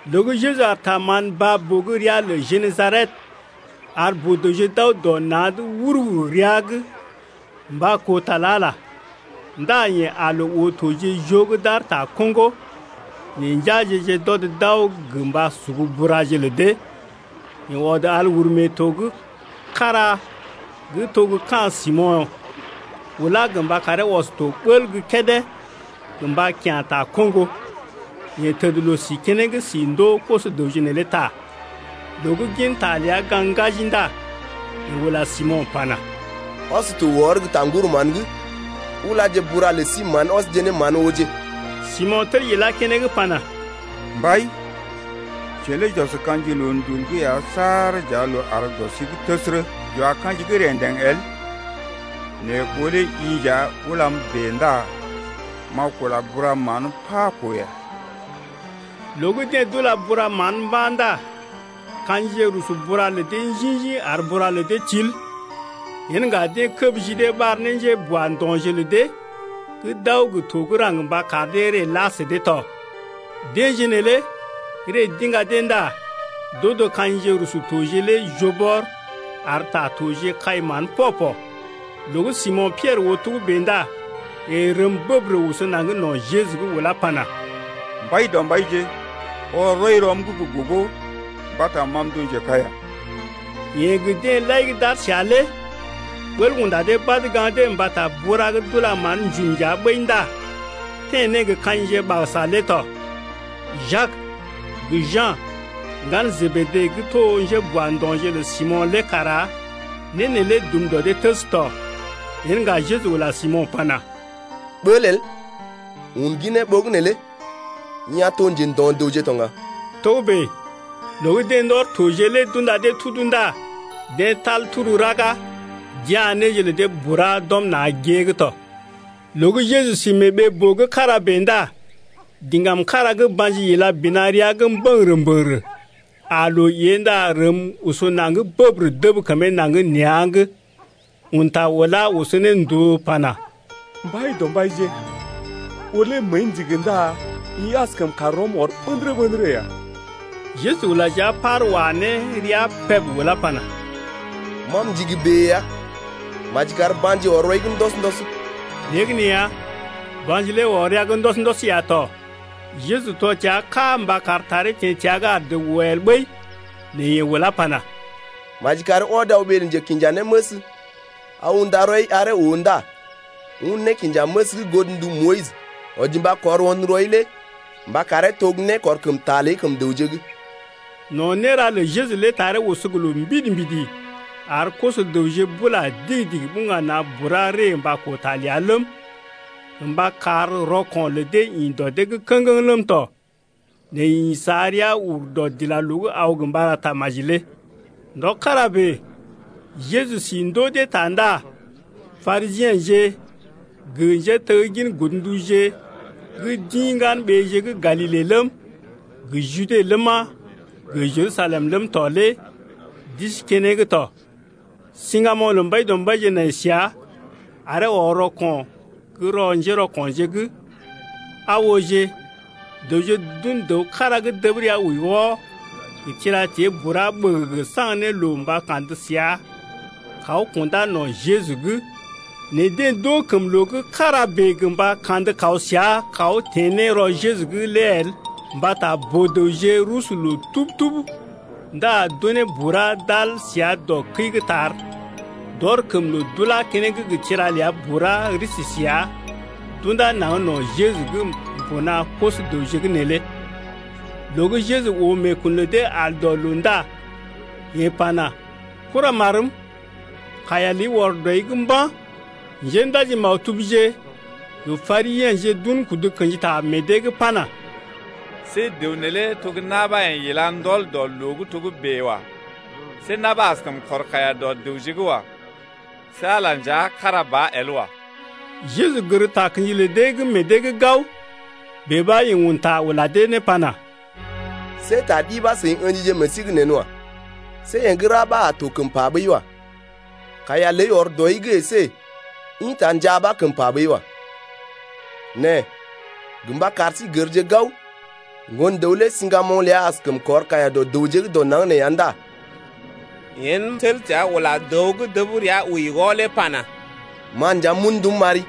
Loo gə́ Jeju aar ta mán baa-boo gə́ ria lə Genesaret ar boo-dəwje d’aw dɔ na̰’d wur-wur rəa’g mba koo ta lə Ala lé ndá yeḛ aa loo oo toje joo gə́ d’aar ta koŋgo nɛ njeaje-je d’ɔd d’aw gə mba sugu buraje lə dee. Yeḛ ɔd al uru mee to’g kára gə́ to gə́ ka̰ Simo̰ ulá gə mba karee ɔs to bəl gə́ kédé gə mba kya̰ ta koŋgo. Yeḛ təd loo-si keneŋ si ndoo koso-dəwje neelé ta. Loo gə́ gin ta ləa gaŋg ŋgaji ndá yeḛ ula Simo̰ pana: Ɔs to wɔr gə́ ta ŋguru mán’g ulaje buraje lə sí mán ɔsje ne mán ooje. Simo̰ tel ilá keneŋ pana: Mbai, jeḛ lé j’ɔs ka̰ji loondul’g ya saar j’ar loo àr dɔ sí’g təsərə, j’wa ka̰ji gə́ rḛdeŋ el, nɛ ɓó lé i nja ulam bèe ndá m’a kula bura mán pá koo ya. Loo gə́ deḛ d’ila bura mán mba̰ ndá ka̰jije rusu bura lə dee njḭ-njḭ ar bura lə dee til. Yen ŋga deḛ kəb ji dee ɓar ne njéboando̰je lə dee gə́ d’aw gə to gə́ raŋg mba kar dee ree la sə dee tɔ. Deḛje neelé ree d’iŋga dee ndá d’odo ka̰jije rusu toje lé joo bɔr ar ta toje kai mán pɔ-pɔ. Loo gə́ Simo̰ Piɛrə oo togə́bè ndá yeḛ rəm bəbərə oso naŋg no̰ Jeju’g ulá pana: Mbaidɔmbaije, ɔr rɔi rɔm’g gə́ gogo mbata ma m’to njekaiya. Yeḛ gə deḛ lai gə́ d’aar səa lé ɓəl unda dee badə gaŋg dee mbata bura gə d’ila mán-njum nja ɓəi ndá teḛ ne gə ka̰jije ɓagəsa lé tɔ. Jak gə Ja̰, ŋgalə Jebede gə́ to njéboando̰je lə Simo̰ lé kara né neelé dum dɔ dee təs tɔ. Yen ŋga Jeju ula Simo̰ pana: Ɓəl el, un ginee ɓogənè lé i a to njendo̰-dəwje to ŋga. Togə́bè loo gə́ deḛ ndɔr toje lé d’unda dee tudu ndá deḛ tal turu raga d’ya̰ néje lə dee bura d’ɔm na̰ gée’g tɔ. Loo gə́ Jeju sí mee ɓee-boo gə́ kára bèe ndá diŋgam kára gə́ ba̰ji ila bina rəa’g mbə̰gərə-mbə̰gərə aa loo ée ndá rəm oso naŋg bəbərə dəb kəmee naŋg nea̰’g, un ta ulá oso ne ndòo pana: Mbaidɔmbaije, ɓó lé məəi ndigi ndá i askəm kar rɔm ɔr ɓə̰dərə-ɓə̰dərə ya. Jeju ula jia par wa ne rəa peb ulá pana: Ma m’ndigi bèe ya, maji kar ba̰ji ɔr rɔi’g ndɔs-ndɔs. Léegəneeya ba̰ji lé ɔr rəa’g ndɔs-ndɔs ya tɔ. Jeju tɔ təa ká mba kar taree teḛ təa’g ar dəw oo el ɓəi. Nɛ yeḛ ulá pana: Maji kari ɔd aw ɓee lə njekinjanéməs aw unda rɔi aree oo ndá un nékinjaməs gə́ godndu Moyis wɔji mba kɔr won rɔi lé mba karee to gə́ nékɔrkəmta ləi kəm dəwje’g. No̰ néra lə Jeju lé taree oso gə loo mbidi-mbidi ar koso-dəwje bula digi-digi buŋga na̰ bura ree mba koo ta ləa ləm, gə mba kar rɔko̰ lə dee ḭ dɔ dee’g kə̰geŋ ləm tɔ. Nɛ yeḛ ḭ sa rəa ur dɔdilaloo’g aw gə mba ra tamaji lé. Ndɔ kára bèe Jeju si ndoo dee ta ndá Parisiḛje gə njéteggin godnduje gə́ d’ḭ ŋgan-ɓeeje gə́ Galile ləm, gə Jude ləma, gə Jerusalem ləm tɔ lé d’isi keneŋ tɔ. Siŋgamoŋ lə Mbaidɔmbaije nai səa aree ɔr rɔko̰ gə́ rɔ njérɔko̰je’g. Aa ooje, dəwje d’un dəw kára gə́ dəb rəa wəi wɔ gə tira-tée bura ɓəgəgə saŋg ne loo mba kandə səa kaw kundá no̰ Jeju’g. Nɛ deḛ d’oo kəm loo gə́ kára bèe gə mba kandə kaw səa kaw teḛ ne rɔ Jeju’g lé el mbata boo-dəwje rusu loo tub-tub ndá d’unee bura d’al səa dɔ kəi’g tar, d’ɔr kəm loo d’ulá keneŋ gə tira ləa bura risi səa d’unda naŋg no̰ Jeju’g mbuna koso-dəwje’g neelé. Loo gə́ Jeju oo meekun lə dee al dɔ loo ndá yeḛ pana: Kuramarm, kaiya ləi ɔr dɔi’g mba̰. Njéndaji-maktubje gə Parisiḛje d’un kudu kḛji ta meḛ dee’g pana: See dəw neelé to gə́ na̰ ɓa yeḛ ila ndɔl dɔ loo’g togə́bè wa. See na̰ ɓa askəm kɔr kaiya dɔ dəwje’g wa. See Ala lé nja kára ba el wa. Jeju gər takə̰ji lə dee gə́ meḛ dee’g gao, bèe ɓa yeḛ un ta ula dee ne pana: See ta ɗi ɓa seḭ ə̰jije meḛ sí’g nḛ wa. See yee gə́ ra ɓa a to kəm pa ɓəi wa, kaiya ləi ɔr dɔi’g əsé ḭta njaa ɓa kəm pa ɓəi wa. Nɛ gə mba kar sí gərje gao, Ŋgon-dəw lé siŋgamoŋ ləa askəm kɔr kaiya dɔ dəwje gə́ dɔ naŋg nee ya ndá yeḛ tel təa ula dəw gə́ dəb rəa wəi wɔ lé pana: Ma nja m’un ndum m’ari,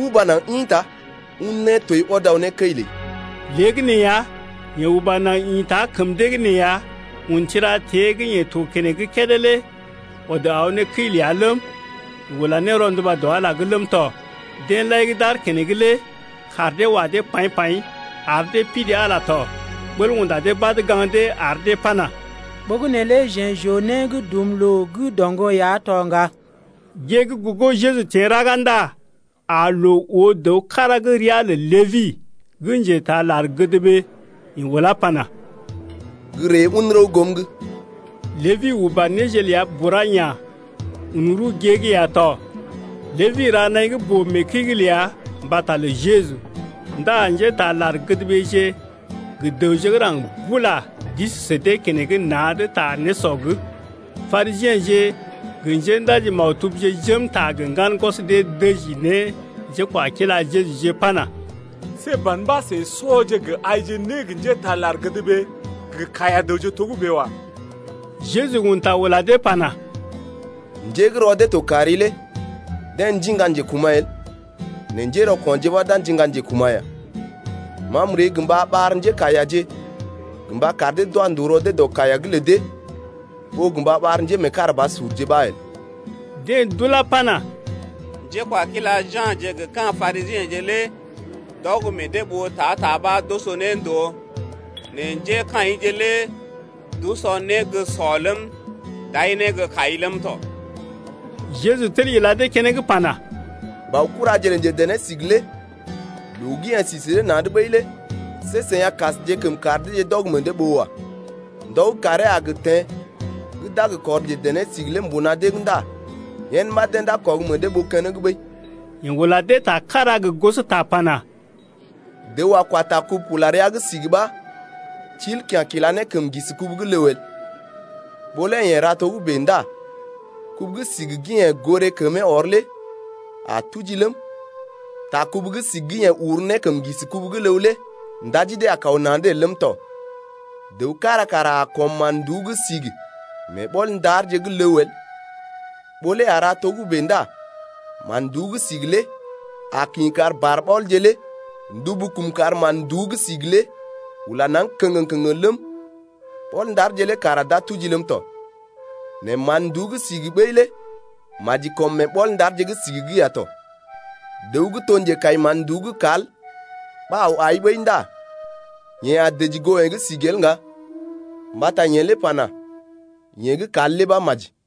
uba naŋg ḭta, un nétoi ɔd aw ne kəi ləi. Léegəneeya, yeḛ uba naŋg ḭta kəm dee’g nee ya un tira-tée gə́ yeḛ to keneŋ kédé lé ɔd aw ne kəi ləa ləm, yeḛ ula ne rɔnduba dɔ Ala’g ləm tɔ. Deḛ lai gə́ d’aar keneŋ lé kaar dee wa dee paḭ-paḭ ar dee pidi Ala lé tɔ. Ɓəl unda dee badə gaŋg dee ar dee pana: Ɓogənè lé jeḛ j’oo né gə́ dum loo gə́ doŋgɔ ya to ŋga. Gée gə́ gogo Jeju teḛ raga ndá aa loo oo dəw kára gə́ ria lə Lébi gə́ njetaa lar-gədɓee. Yeḛ ulá pana: Gə́ ree un rəw goom’g. Lébi uba néje ləa bura ya̰, un rəw gée’g ya tɔ. Lébi ra naḭ gə́ boo mee kəi’g ləa mbata lə Jeju ndá njétaa lar-gədɓeeje gə dəwje gə́ raŋg bula d’isi sə dee keneŋ na̰’d ta nésɔ’g. Parisiḛje gə njéndaji-maktubje jém ta gə ŋgan gwɔs dee dəji ne njékwakila Jejuje pana: See ban ɓa seḭ sɔje gə aije né gə njétaa lar-gədɓee gə kaiya-dəwje togə́bè wa. Jeju un ta ula dee pana: Njé gə́ rɔ dee to kari lé deḛ ndiŋga njekuma̰ el nɛ njérɔko̰je ɓa d’a ndiŋga njekuma̰ ya. Ma m’ree gə mba ɓar njékaiyaje gə mba kar dee d’wa ndòo rɔ dee dɔ kaiya’g lə dee ɓó gə mba ɓar njémeekarabasurje ɓa el. Deḛ d’ulá pana: Njékwakila Ja̰je gə ka̰ Parisiḛje lé d’ɔg meḛ dee ɓoo ta-ta ɓa d’oso ne ndòo nɛ njékaḭje lé d’usɔ né gə́ sɔ ləm, d’ai né gə́ kai ləm tɔ. Jeju tel ila dee keneŋ pana: Baokuraje lə njedené-sigi lé loo gə́ yeḛ si sə dee na̰’d ɓəi lé see seḭ a kasjekəm kar deeje d’ɔg meḛ dee ɓoo wa. Ndɔ gə́ kàree a gə teḛ gə́ d’a gə kɔr njedené-sigi lé mbuna dee’g ndá yen ɓa deḛ d’a kɔg meḛ dee ɓoo keneŋ ɓəi. Yeḛ ula dee ta kára gə gosota pana: Dəw a kwa ta kubu-kula-rəa’g sigi ɓa til kya̰ kila ne kəm ŋgisi kubu el, ɓó lé yeḛ ra togə́bè ndá kubu gə́ sigi gə́ yeḛ goré kəmee ɔr lé a tuji ləm, ta kubu gə́ sigi gə́ yeḛ uru ne kəm ŋgisi kubu lé ndaji dee a kaw na̰’d el ləm tɔ. Dəw kára kara a kɔm mán-nduú gə́ sigi mee ɓɔl-ndarje gə́ ləw el, ɓó lé a ra togə́bè ndá mán-nduú gə́ sigi lé a kḭ kar barɓɔlje lé ndubu kum kar mán-nduú gə́ sigi lé ula naŋg kəŋgəŋ-kəŋgəŋ ləm, ɓɔl-ndarje lé kara d’a tuji ləm tɔ. Nɛ mán-nduú gə́ sigi ɓəi lé maji kɔm mee ɓɔl-ndarje gə́ sigi’g ya tɔ. Dəw gə́ to njekai mán-nduú gə́ kal ɓa aw ai ɓəi ndá yeḛ a dəji goo yee gə́ sigi el ŋga mbata yeḛ lé pana: Yee gə́ kal lé ɓa maji.